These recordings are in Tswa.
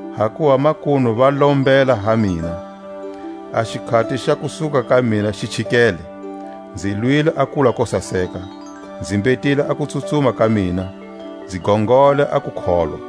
Hakuva makunu va lombela ha mina, a xikhati xa kusuka ka mina xi chikele. Nzi lwile a kulwa ko saseka, nzi mbhetile a kutsutsuma ka mina, nzi gongole a kukholwa.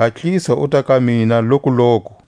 Hatlisa uta ka mina lokuloku,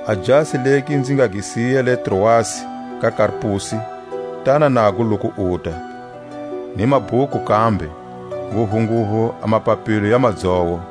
A jasi legi nzi nga gi siya le Troasi ka Karpusi, tana nago loku uta, ni mabhuku kambe, nguvunguvu a mapapilo ya madzowo.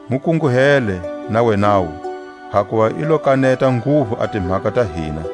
Mu kunguhele na wenawu, hakuva i lo kaneta nguvu a timhaka ta hina.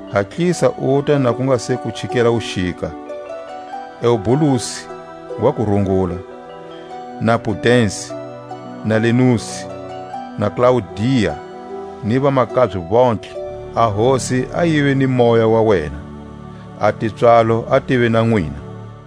Hatlisa uta na ku nga se ku chikela wuxika. Eubulusi wa ku rungula, na Pudensi, na Linusi, na Klaudia, ni vamakabye vontlhe. A Hosi a yive ni moya wa wena. A tipswalo a tive na nwina.